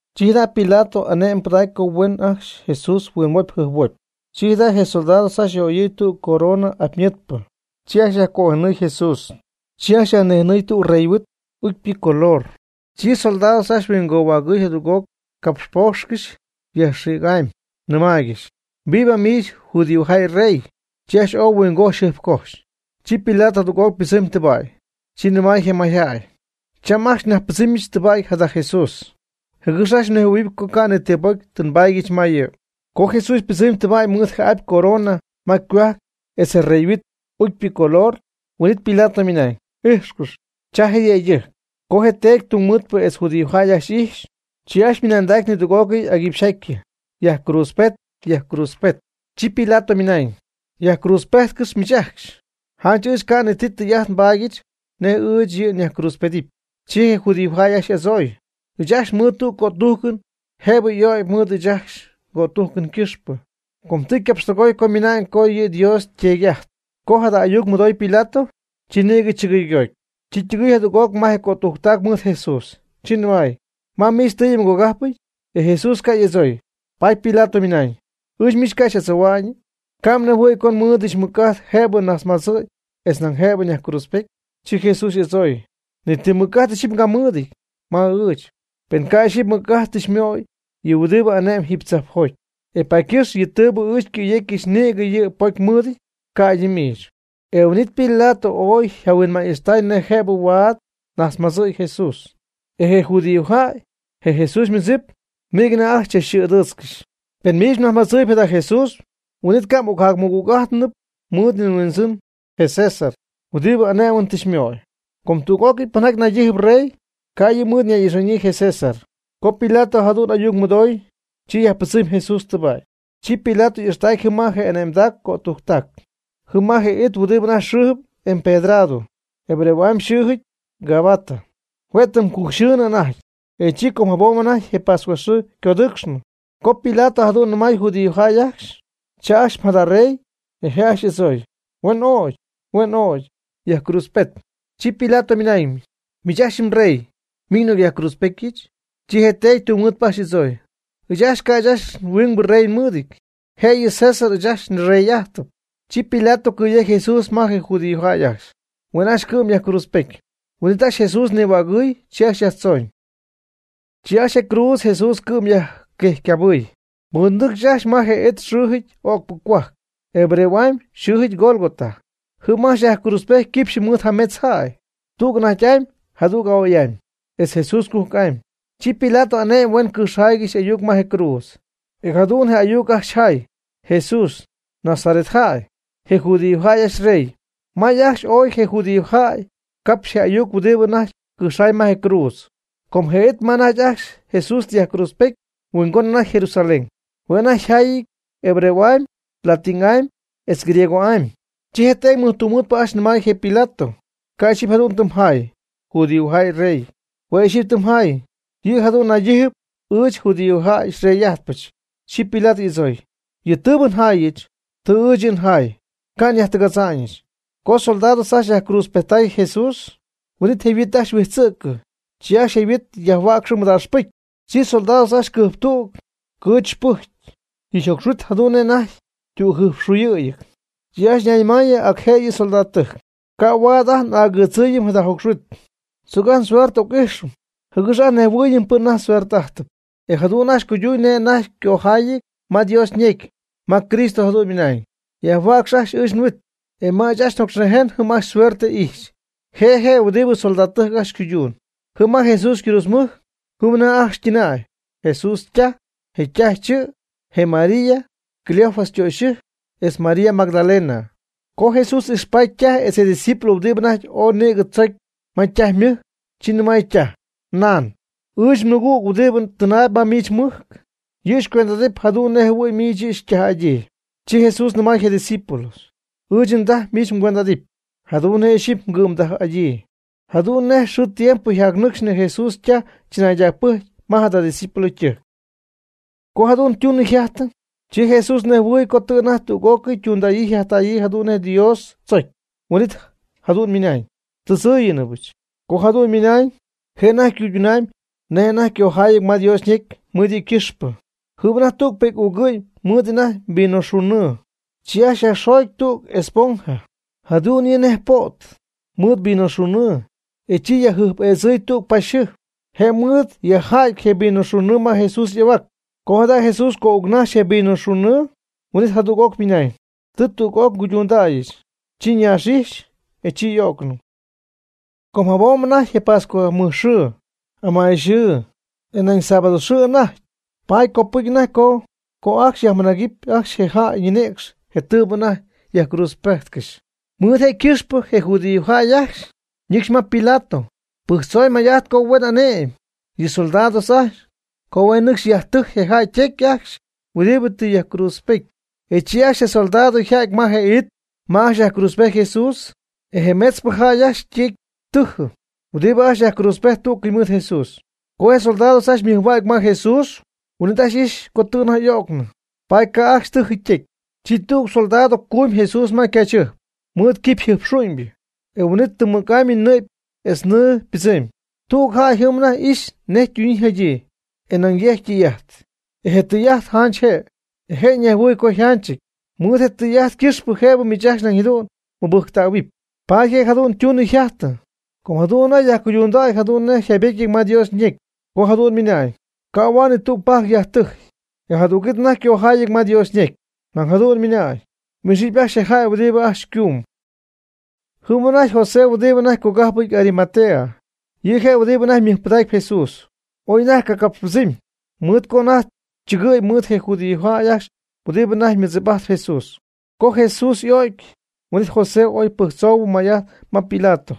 Chi jada' Pilato ané'mɨn pɨdacy co huen ajcxy Jesús huinhuopy jɨjphuopy. Chi jada' je soldados ajcxy yaj'oyɨɨy tüg corona mɨj'apy pa'apy, chi ajcxy yajcojenɨy Jesús. Chi ajcxy yajnïjenɨɨy tüg rey yhuit ucypɨ ycolor. Chi soldados ajcxy huingohuägɨɨy jadüg'oc capxpoocxcɨxy yajxïgy'amy, nɨmaaygɨxy: ―¡Viva miich judíojäy rey! Chi ajcxy ooy huingojxy jɨjpcojxy. Chi Pilato jadüg'oc ypɨdzɨmy tɨba'y. Chi nɨmay je mayjäy: ―Cham ajcxy nyajpɨdzɨmy tɨba'y jada Jesús, jɨgɨx ajcxy mnejhuɨ̈huɨp co ca' ni ti pocy tɨ nbaadyɨch ma yɨ'. Co Jesús ypɨdzɨmy tɨba'y mɨɨd je apy corona ma ycohuajc etz je rey yhuit ucypɨ ycolor. Huin'it Pilato ymɨnañ: ―Ijxcɨx, cha je yëydɨjc. Co je teedy tungmɨɨdpɨ etz je judiojäy ajcxy ijxy, chi ajcxy ymɨnanday nidüg'ócɨy aguipxyjatyɨ: ―Yajcruudzpet, yajcruudzpet. Chi Pilato ymɨnañ: ―Yajcruudzpejtcɨx miich ajcxy, janch ɨɨch ca' ni ti tɨy'ajt nbaadyɨch nej ɨɨch yɨ' nyajcruudzpedɨpy. Chi je judiojäy ajcxy y'adzooy: ―Ɨɨch ajcxy mɨɨd tüg cötujcɨn, jëbɨ y'ögy mɨɨd ɨɨch ajcxy ngötujcɨn ycɨxpɨ, com tɨ ycapxtɨgooy co ymɨna'ñ co yɨ Dios yteedy'ajtyp. Co jada ayuc mɨdooy Pilato, chi nïgɨ chɨgɨygoty. Chi ytɨgɨɨy jadüg'oc ma je cötujctac mɨɨd Jesús, chi nɨmay: ―¿Ma miich tɨɨyɨ mgogajpɨty? E Jesús ca' y'adzooy. Paady Pilato ymɨnañ: ―¿Ɨɨch miich ca' xy'adzohua'ñ? ¿Ca' mnejhuɨ̈y co nmɨɨdɨdyɨch mɨc'ajt jëbɨ nnajtzmadzɨ̈y etz nañ jëbɨ nyajcruudzpety? Chi Jesús y'adzooy: ―Ni ti mɨc'ajt ixyipy mgamɨɨdɨty ma ɨɨch, pen ca' ixyipy mɨc'ajt tɨ xymöyɨch yɨ huɨdibɨ ane'mb jiiby tzajpjoty. E paady ycɨxpɨ yɨ tɨɨbɨ ɨɨch xycɨ̈yecyɨch nïgɨ yɨ' pocy mɨɨdɨty ca'ydɨ miich. E huin'it Pilato ooy yjahuinma'ñ ixtay nej huaad ca' jëbɨ ocnajtzmadzɨɨy Jesús. E je judíojäy, je Jesús ymɨdzip, nïgɨ anajty ajcxy chachxɨ̈'ɨdɨ̈ch: ―Pen miich mnajtzmadzɨɨyb jada Jesús, huin'it ca' m'ocjacnaymɨgüg'ájtɨnɨpy mɨɨd yɨ mhuindzɨn je César huɨdibɨ ané'mɨn tɨ xymöy. Com tüg'ócɨy pɨnjaty naydijɨp rey, ca' yɨ' mɨɨd nay'ixa'ñyii je César. Co Pilato jadu'n ayuc mɨdooy, chi yajpɨdzɨmy Jesús tɨba'y. Chi Pilato y'ixtacy jɨm ma je' y'ane'mdac ycötujctac, jɨm ma je it huɨdibɨ anajty xɨɨjɨp Empedrado, hebreo'amy xɨɨjɨty Gabata. Hue' tɨm cujcxɨɨ anajty, e chi com jabom anajty je pascuaxɨɨ ycodɨɨcxnɨ, co Pilato jadu'n nɨmay judíojäy ajcxy: ―Cha ajcxy jada mrey. E je' ajcxy y'adzooy: ―Huen ögy, huen ögy. Yajcruudzpet. Chi Pilato ymɨnañ: ―Miich ajcxy mrey, ¿miñ n'ocyajcruudzpétyɨchɨ? Chi je teedy tungmɨɨdpɨ ajcxy y'adzooy: ―Ɨɨch ajcxy ca' ɨɨch ajcxy huingbɨ rey nmɨɨdɨty, jëyɨ César ɨɨch ajt nrey'ajtɨm. Chi Pilato cɨ̈yejcy Jesús ma je judíojäy ajcxy, huen ajcxy cɨ'm yajcruudzpety. Huin'it ajcxy Jesús nihuägɨɨy. Chi ajcxy yajtzooñ. Chi ajcxy je cruudz Jesús cɨ'm yajquejcycabɨɨy. Mɨɨd nɨcx ajcxy ma je it xɨɨjɨty o'cpɨ cohuajc, hebreo'amy xɨɨjɨty Gólgota. Jɨm ajcxy yajcruudzpejty quipxyɨ mɨɨd jametz jäy, tüg anajty'amy, jadüg a'oy'amy etz Jesús cujc'amy. Chi Pilato ane'my huen cɨjxjay ayuc ma je cruudz, e jadu'n je ayuc ajcxy jay: “Jesús, Nazaret jäy, je judíojäy ajcxy yrey.” May ajcxy ooy je judíojäy capxy je ayuc huɨdibɨ anajty cɨjxjay ma je cruudz. Com je it ma anajty ajcxy Jesús tɨ yajcruudzpejtcɨxy mɨhuingon anajty Jerusalén. Hue' anajty yjayɨty: hebreo'amy, latin'amy etz griego'amy. Chi je teedy mɨjtungmɨɨdpɨ ajcxy nɨmay je Pilato: ―Ca' ixyipy jadu'n tɨ mjay: “Judíojäy yrey”. Hue' ixyipy tɨ mjay: “Yɨ' jadu'n naydijɨp ɨɨch judíojäy xyrey'ajtpɨch.” Chi Pilato y'adzooy: ―Yɨ tɨɨbɨ njaayɨch, tɨ ɨɨch yɨ' njaay, ca' nyajtɨgadza'ñɨch. Co soldados ajcxy yajcruudzpejttay je Jesús, huin'it je' yhuit ajcxy huijtzɨ'cɨ. Chi ajcxy je huit yajhuäcxy mɨdaaxpɨcy. Chi soldados ajcxy cɨjptüg cɨɨchypɨjcy. Yɨ' yjocxhuit jadu'n nej anajty ytügjɨjpxuyɨ̈yɨty. Chi ajcxy ñayñɨmayɨ ac jëyɨ soldadtɨjc: ―Ca' huaad ajt n'agɨɨdzɨɨyɨm jada jocxhuit. Tzoc ajt suerte n'oc'ijxɨm, jɨgɨx ajt nnejhuɨɨyɨm pɨn anajty suerte'ajtɨp. E jadu'n ajcxy cuyduñ nej anajty ycojaayɨty ma Dios ñecy, ma Cristo jadu'n ymɨnañ: “Yajhuäcx ajcxy ɨɨch nhuit, e ma ɨɨch njocxnïjen jɨm ajcxy suerte ijxy.” Je' je' huɨdibɨ soldadtɨjc ajcxy ycuyduun. Jɨm ma Jesús ycruudzmɨjc, jɨm anajty ajcxy ytɨnäy: Jesús ytaj, je ytaj chɨ', je María (Cleofas ytöxyɨjc), etz María Magdalena. Co Jesús ijxpaty ytaj etz je ydiscípulo huɨdibɨ́ anajty ooy nïgɨ tzocy ma ytaj ymɨjc, chi nɨmay ytaj: ―Nan, ɨɨch nmɨgüg huɨdibɨ tɨnaayb ma miich mmɨjc, yɨ' xycuend'adɨp jadu'n nej jɨhuɨ̈y miich yɨ' xytaj'adyii. Chi Jesús nɨmay je' ydiscípulo: ―Ɨɨch ndaj miich mgüend'adɨpy, jadu'n nej ixyipy mgɨ'mdaj'adyii. Jadu'n nej xɨɨ tiempo jac nɨcxnɨ Jesús ytaj tzɨnaydacpɨcy ma jada discípulo ytɨjc. Co jadu'n ytundaayɨ yjajtaayɨ, chi Jesús nejhuɨɨy co tɨ anajty tüg'ócɨy ytundäyii yjajtäyii jadu'n nej Dios tzocy. Huin'it jadu'n ymɨnañ: ―Tɨdzɨ́ɨyɨnɨbɨch. Co jadu'n ymɨnañ, je' anajty ycuydundaayb nej anajty ycojayɨty ma Dios ñecy mɨɨd yɨ' ycɨxpɨ. Jɨm anajty tüg pi'c uugɨ'ñ ymɨɨd anajty vinoxunnɨɨ. Chi ajcxy je' yajxoogy tüg esponja (jadu'n yɨ' nej po't) mɨɨd vinoxunnɨɨ, e chi yajjɨjp'eedzɨɨy tüg paxyjɨjp, je' mɨɨd yajjädy je vinoxunnɨɨ ma Jesús y'ahuac. Co jada' Jesús co'uucnajxy je vinoxunnɨɨ, huin'it jadu'n ymɨnañ: ―Tɨ tüg'ócɨy nguydundäyɨch. Chi ñaax'ijxy, e chi y'o'cnɨ. Com jabom anajty je pascua mɨjxɨɨ (amayxɨɨ ooy), e nañ sábado xɨɨ anajty. Paady copɨcy anajty co ajcxy yajmɨnájcɨpy ajcxy je jäy ninïcx je tɨɨbɨ anajty yajcruudzpejtcɨxy. Mɨɨd je' ycɨxpɨ je judíojäy ajcxy ñɨcxy ma Pilato pɨjctzoy may'ajt co huen ane'my yɨ soldados ajcxy, co huen nɨcxy yajtɨjy je jäy ytecy ajcxy huɨdibɨ tɨ yajcruudzpety. E chi ajcxy je soldados yja'ty ma je it ma ajcxy yajcruudzpejty Jesús. E je metzpɨ jäy ajcxy ytecy tɨjɨ huɨdibɨ ajcxy yajcruudzpejt tú'cɨy mɨɨd Jesús. Co je soldados ajcxy ymɨjhuägy ma Jesús, huin'it ajcxy ijxy co tɨ anajty y'o'cnɨ, paady ca' ajcxy tɨjɨ ytecy. Chi tüg soldado cumy Jesús ma ycaachyjɨjp mɨɨd quipy jɨjpxu'ñybɨ. E huin'it tɨm mɨc'amy nɨ'py etz nɨɨ ypɨdzɨmy. Tüg jäy jɨm anajty ixy nej ytunɨ yjajtɨ, e nañ yejc tɨy'ajt. E je' ytɨy'ajt janch je', e je' nejhuɨɨyb co yjanchɨty. Mɨɨd je tɨy'ajt ycɨxpɨ jëbɨ miich ajcxy nañ jadu'n mmɨbɨjctähuɨp. Paady je' jadu'n ytunɨ yjajtɨ, co jadu'n anajty yajcuyduna'ñ jadu'n nej yjaybetyɨty ma Dios ñecy, co jadu'n ymɨnañ: “Ca' huaad ni tüg ypajc yajtɨjy.” E jadüg'it anajty ycojaayɨty ma Dios ñecy, ma jadu'n ymɨnañ: “Y'ixɨpy ajcxy je jäy huɨdibɨ ajcxy ycuum.” Jɨm anajty José huɨdibɨ anajty cogájpɨp Arimatea. Yɨ' je' huɨdibɨ anajty mɨjpɨdacp Jesús, oy anajty ca' capxpɨdzɨmy, mɨɨd co anajty chɨgɨ̈y mɨɨd je judiojäy ajcxy huɨdibɨ anajty mɨdzip'ajtp Jesús. Co Jesús y'o'cy huin'it José oy pɨjctzoy may'ajt ma Pilato,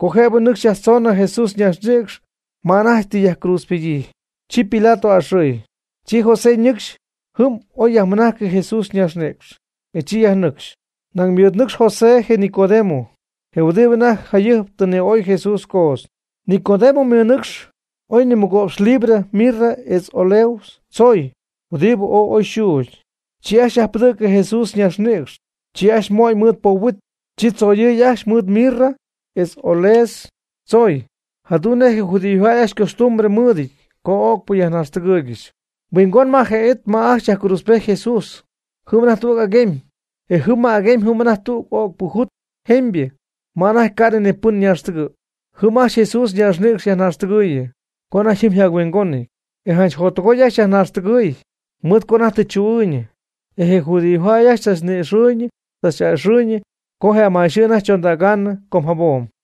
co jëbɨ nɨcxy yajtzoonɨ Jesús ñaaxnïcx ma anajty tɨ yajcruudzpedyii. Co Pilato a'ɨxɨy, chi José ñɨcxy jɨm oy yajmɨnajcɨ je Jesús ñaaxnïcx, e chi yajnɨcxy. Nañ mɨɨd ñɨcxy José je Nicodemo, je huɨdibɨ anajty jayɨjp tɨ ni'oy Jesús coodz. Nicodemo ymɨnɨcx oy nimɨgo'px libra mirra etz áloes tzooy huɨdibɨ ooy oy yxuugy. Chi ajcxy yajpɨdɨ̈cɨ Jesús ñaaxnïcx, chi ajcxy mo'ñ mɨɨd poob huit, chi tzoyɨy ajcxy mɨɨd mirra etz áloes tzooy, jadu'n nej je judíojäy ajcxy ycostumbre mɨɨdɨty co o'cpɨ yajnaaxtɨgɨɨygɨxy. Huingon ma je it ma ajcxy yajcruudzpejty Jesús, jɨm anajty tüg aguemy, e jɨm ma je aguemy jɨm anajty tüg o'cpɨ jut jemybɨ ma anajty ca'nɨ pɨn ñaaxtɨgɨ̈y. Jɨm ajcxy Jesús ñaaxnïcx yajnaaxtɨgɨɨyɨ, co anajty jɨm yjac-huingonɨty, e janch jottɨgooy ajcxy yajnaaxtɨgɨɨy, mɨɨd co anajty tɨ chu'ɨɨyñɨ, e je judíojäy ajcxy tzachni'ixɨɨyñɨ tzach'a'ɨxɨɨyñɨ co je amayxɨɨ anajty chondägaanɨ com jabom.